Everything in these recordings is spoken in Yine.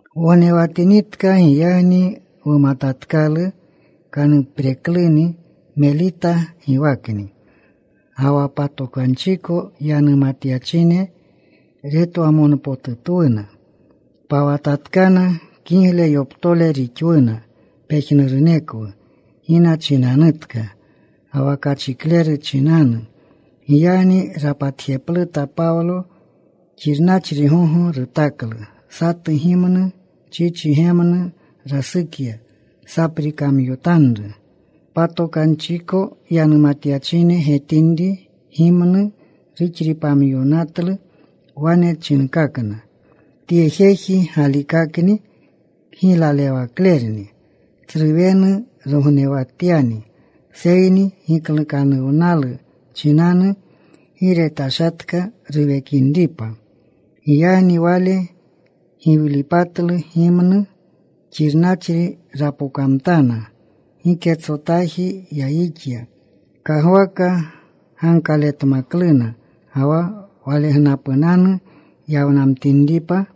Wognewatinitka. Giyagni wumatatkalu kaniprekluni. Melita giwakni. Ga wa patokanchiko yanumatyachine retwamonpotutwuna. Pawatatkana. Kigle yoptole rixwuna pejnurunekwu gina chinanutka ga wa kachikleru chinanu. Giyagni rapatjepluta Pawlo. Xirnachri gogo rutaklu. Satu gimnu chichi gemnu rasukya. Saprikamyomtanru. Patokanchiko yanumatyachine getinri gimnu ruxripamyonatlu, wane chinkakna, “Tye jeji galikakni kgiylalewaklerni. Tsru wenu rognewatyani, seyni kgiklukanuwnalu chinanu gi retashatka ruwekinripa.” Giyagni wale giwlipatlu gimnu. Xirnachri rapokamtana. Giketsotaji yayixya. Kagwaka gankaletmakluna, ga wa walegnapunanu yawnamtinripa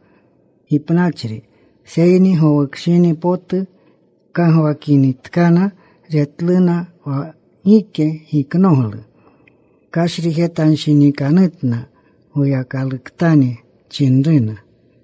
gipnachri. Seyni gowukshini potu kagwakinitkana, retluna wa gike giknoglu. Kashrijetanshinikanutna. Goyakaluktani chinruna.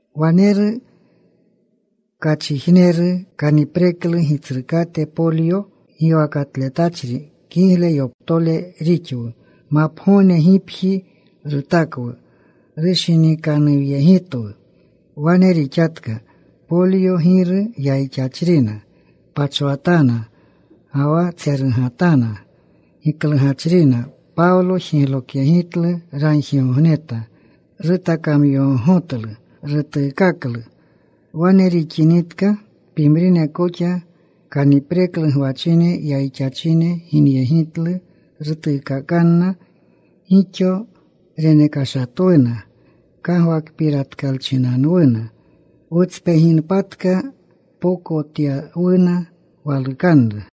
Waneru kachijneru, kanipreklu gitsrukate. Poplyo giwakatletachri. Kigle yoptole rixwu. Mapgogne gipji rutakwu. Rushinikanuwyegitwu. Wane rixatka. Poplyo giru yayixachrina. Pachwatana ga wa tserugatana, giklugachrina. Pawlo jiglokyegitlu. Ragjigogneta. Rutakamyogogotlu. Rutuukaklu. Wane rixinitka, pimrine koxa kanipreklu gwachine, yayixachine ginyegitlu. Rutuukaakana. Gixo renekashatwuna kagwakpiratyachinanwuna. Wutspeginpatka pokotyawuna walukanru.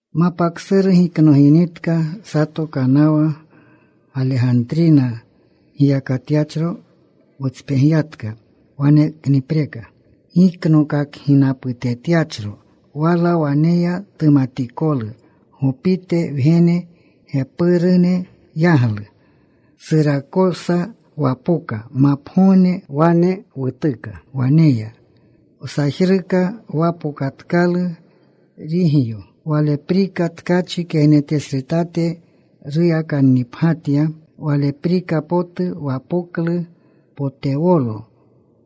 Mapa ksuru giknoginitka, sato kanawa Galegantrina giyakatyachro wutspegyatka, waneknipreka giknokakginaputetyachro. Wala waneya tumatikolu Gopite wgenene gepirune yaglu. Surakosa wapoka. Mapgogne wane wutuka. Waneya wsajruka. Wapokatkalu Rigyo. Waleprika tkachi kegnetesretate ruyakannipgyatya. Waleprika potu wapoklu Potewolo.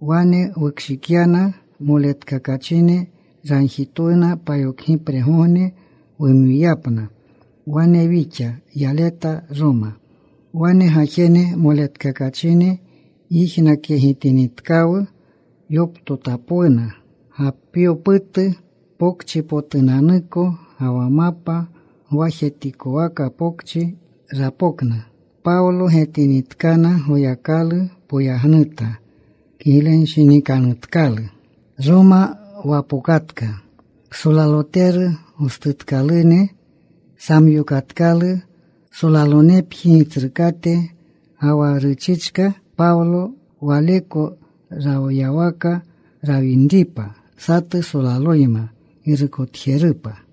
Wane wukshikyana moletkakachine. Ragjitwuna payokgipregogne wumwiyapna. Wane wixa yaleta Roma. Wane gajene moletkakachine yijnakyegitinitkawu, yoptotapwuna. Gapyoputu Pokchipotunanuko ga wa Mapa Gwajetikwaka Pokchi rapokna. Pawlo getinitkana, Goyakalu poyagnuta. Kiglenshinikanutkalu. Roma wapokatka. Ksolaloteru gostutkalune samyokatkalu solalonepji gitsrukate. Ga wa ruchichka Pawlo waleko rawyawaka rawinripa, satu solaloyma girukotjerupa.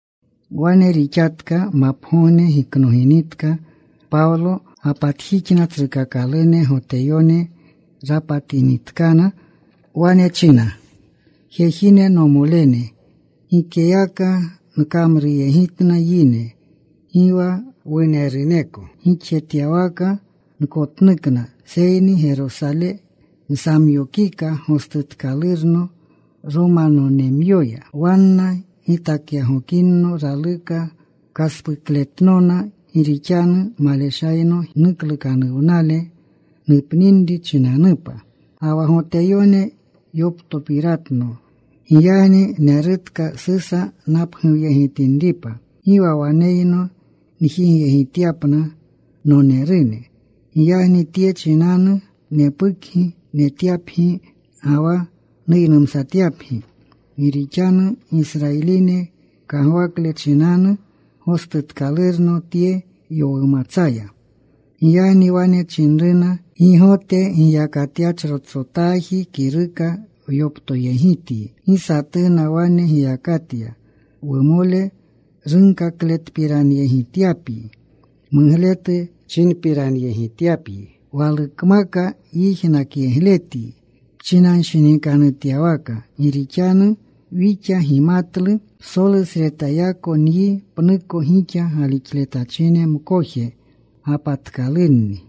Wane rixatka. Mapgogne giknoginitka, Pawlo gapatjixna tsrukakalune Goteyone. Rapatinitkana wane chinna, “Jejine, nomolene, gikeyaka nkamruyegitna yine. Gi wa wuneruneko gixjetyawaka nkotnuka. Seyni Gerosale nsamyokika gostutkalurno Romanonemyoya. Wanna gitakyagokinno, raluka kaspukletnona, gi rixanu maleshayno nuklukanuwnale nupninri chinanupa. Ga wa Goteyone yoptopiratno. Giyagni nerutka Susa napguwyegitinripa. Gi wa waneyno njigyegityapna nonerune. Giyagni tye chinanu nepukgi netyapgi ga wa nuynumsatyapgi. Gi rixanu Gisrayiline kagwakle chinanu gostutkalurno tye yowumatsaya.” Giyagni wane chinruna, “Gi Gote giyakatyachrotsotaji kiruka wyoptoyegityi. Gi satuna wane giyakatya wumole runkakletpiranyegityapyi, mugletu chinpiranyegityapyi. Walukmaka yijnakyegletyi pchinanshinikanutyawaka. Gi rixanu wixa gimatlu psolusretayako nyi pnuko gixa galixletachine mkoje gapatkalunni.”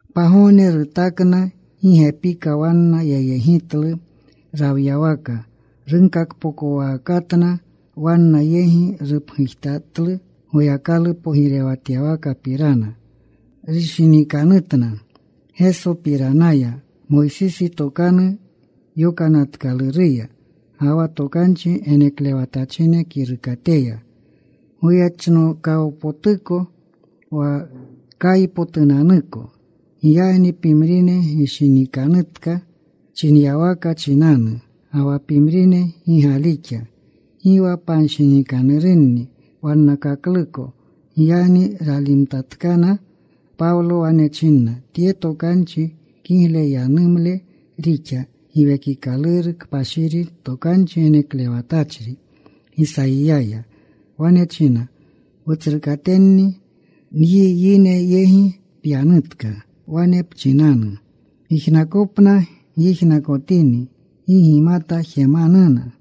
Pagogne rutakna. Gi gepika wanna yayegitlu rawyawaka. Runkakpokowakatna. Wanna yegi rupgujtatlu Goyakalu pogirewatyawakapirana. Rushinikanutna Gesopiranaya Moysisi Tokanu Yokanatkaluruya, ga wa tokanchi geneklewatachine kirukateya, goyechnokawpotuko wa kaypotunanuko. Giyagni pimrine gishinikanutka chinyawaka chinanu, ga wa pimrine gi galixa. Gi wa panshinikanurunni wannakakluko. Giyagni ralimtatkana. Pawlo wane china tye tokanchi, “Kigle yanumle rixa Giwekikaluru Kpashiri, tokanchi geneklewatachri Gisayiyaya. Wane chinna wutsrukatenni: Nyi yine yegi pyanutka. Wane pchinanu: Gijnakopna gyijnakotini, gi gimata jemanuna.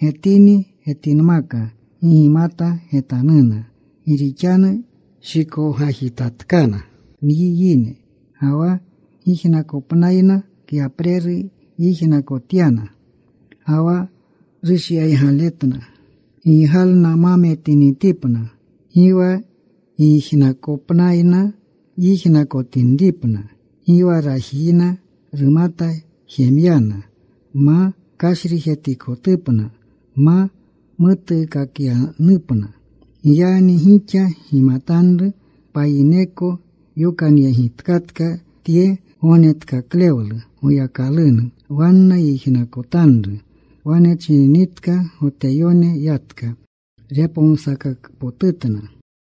Getini getinmaka, gi gimata getanuna. Gi rixanu shikowgajitatkana nyi yine. Ga wa gijnakopnayna kyapreru yijnakotyana Ga wa rushyaygaletna. Giygalna ma metinitipna. Gi wa gijnakopnayna yijnakotinripna. Gi rajiyakna rumata jemyana, ma kashrijetikotupna, nma mutuukakyanupna. Giyagni gixa gimatanru payineko yokanyegitkatka tye gognetkaklewlu Goyakalunu. Wanna yijnakotanru.” Wane chininitka, Goteyone yatka. Repomsakakpotna.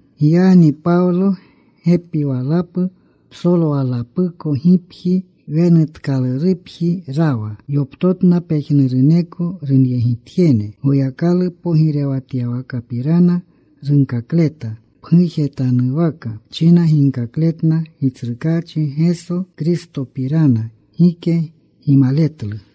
Giyagni Pawlo gepi walapu psolwalapuko gipji wenutkalurupji rawa. Yoptotna pejnuruneko runyegitjene. Goyakalu pogirewatyawakapirana runkakleta. Pgujetanwaka china ginkakletna Gitsrukaachi Geso Kristopirana. Gike gimaletlu.